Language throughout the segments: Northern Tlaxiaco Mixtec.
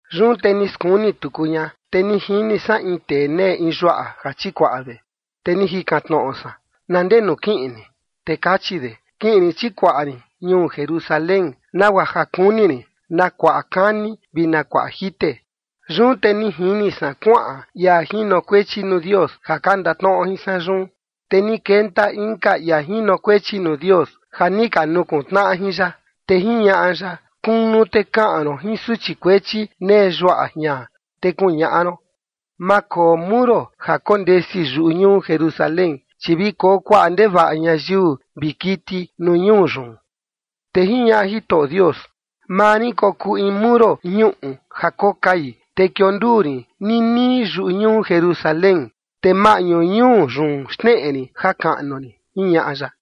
Yun te ni skuni tuku ña, te ni jini san in tee nee in yuaꞌa ja chikuaꞌa de. Te ni jikan tnoꞌo san: “¿Na ndenu kiꞌin ni?” Te kachi de: “Kiꞌin rin chikuaꞌa rin ñuu Jerusalén, nagua ja kuni rin na kuaꞌa kani vi na kuaꞌa jite”. Yun te ni jini san kuaꞌan ia jinokuechi nuu Dios ja ka ndatnoꞌo jin san yun, te ni kenta inka ia jinokuechi nuu Dios ja ni ka nukuntnaꞌa jin ya. Te jiñaꞌa ya: “Kunu te kaꞌan ron jin suchi kuechi nee yuaꞌa jian, te kuñaꞌa ron: Ma koo muro ja kondesi yuꞌu ñuu Jerusalén, chi vi koo kuaꞌa ndevaꞌa ñayiu vi kiti nuu ñuu yun”. Te jiñaꞌa Jitoꞌo Dios: “Maa rin kokuu in muro ñuꞌu ja kokai, te kionduu rin ninii yuꞌu ñuu Jerusalén, te maꞌñu ñuu yun xneꞌe rin jakaꞌnu rin”, jiñaꞌa ya.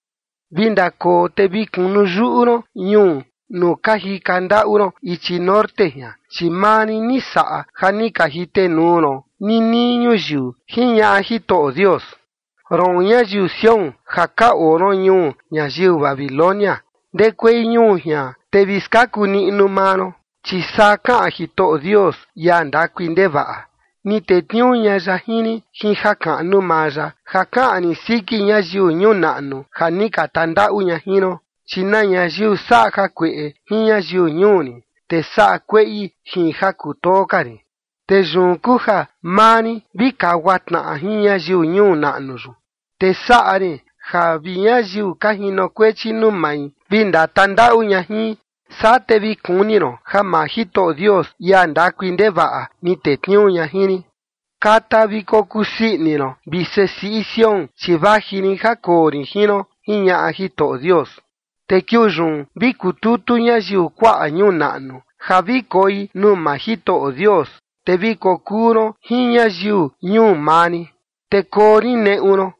“Vi ndakoo te vi kunu yuꞌu ron ñuu nuu ka jika ndaꞌu ron ichi norte jian, chi maa rin ni saꞌa ja ni ka jitenuu ron ninii ñuyiu”, jiñaꞌa Jitoꞌo Dios. “Roon, ñayiu Sión ja ka oo ron ñuu ñayiu Babilonia, ndekuei ñuu jian, te vi skaku niꞌnu maa ron”. Chi saa kaꞌan Jitoꞌo Dios, ia ndakui ndevaꞌa: “Ni tetniuu ña ya jin rin jin jakaꞌnu maa ya ja kaꞌan rin siki ñayiu ñuu naꞌnu ja ni ka tandaꞌu ña jin ron, chi na ñayiu saꞌa kueꞌe jin ñayiu ñuu rin, te saꞌa kueꞌi jin ja kutoo ka rin. Te yun kuu ja maa rin vi kagua tnaꞌa jin ñayiu ñuu naꞌnu yun, te saꞌa rin ja vi ñayiu ka jinokuechi nuu mai vi ndatandaꞌu ña jin, saa te vi kuni ron ja maa Jitoꞌo Dios, ia ndakui ndevaꞌa ni tetniuu ña jin rin.” “Kata vi kokusii ini ron, vi sesiꞌi Sión, chi vaji rin ja koo rin jin ron”, jiñaꞌa Jitoꞌo Dios. “Te kiuu yun vi kututu ñayiu kuaꞌa ñuu naꞌnu ja vi koi nuu maa Jitoꞌo Dios, te vi kokuu ron jin ñayiu ñuu maa rin, te koo rin neꞌu ron.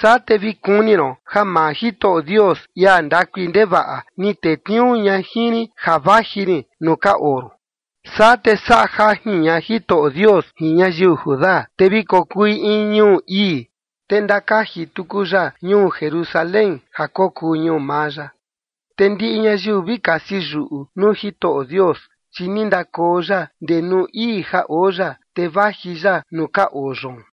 Saa te vi kuni ron ja maa Jitoꞌo Dios, ia ndakui ndevaꞌa, ni tetniuu ña jin rin ja vaji rin nuu ka oo ron.” Saa, te saꞌa jajin ña Jitoꞌo Dios jin ñayiu Judá, te vi kokui in ñuu ii, te ndakaji tuku ya ñuu Jerusalén ja kokuu ñuu maa ya. Te ndiꞌi ñayiu vi kasi yuꞌu nuu Jitoꞌo Dios, chi ni ndakoo ya ndee nuu ii ja oo ya, te vaji ya nuu ka oo yoon.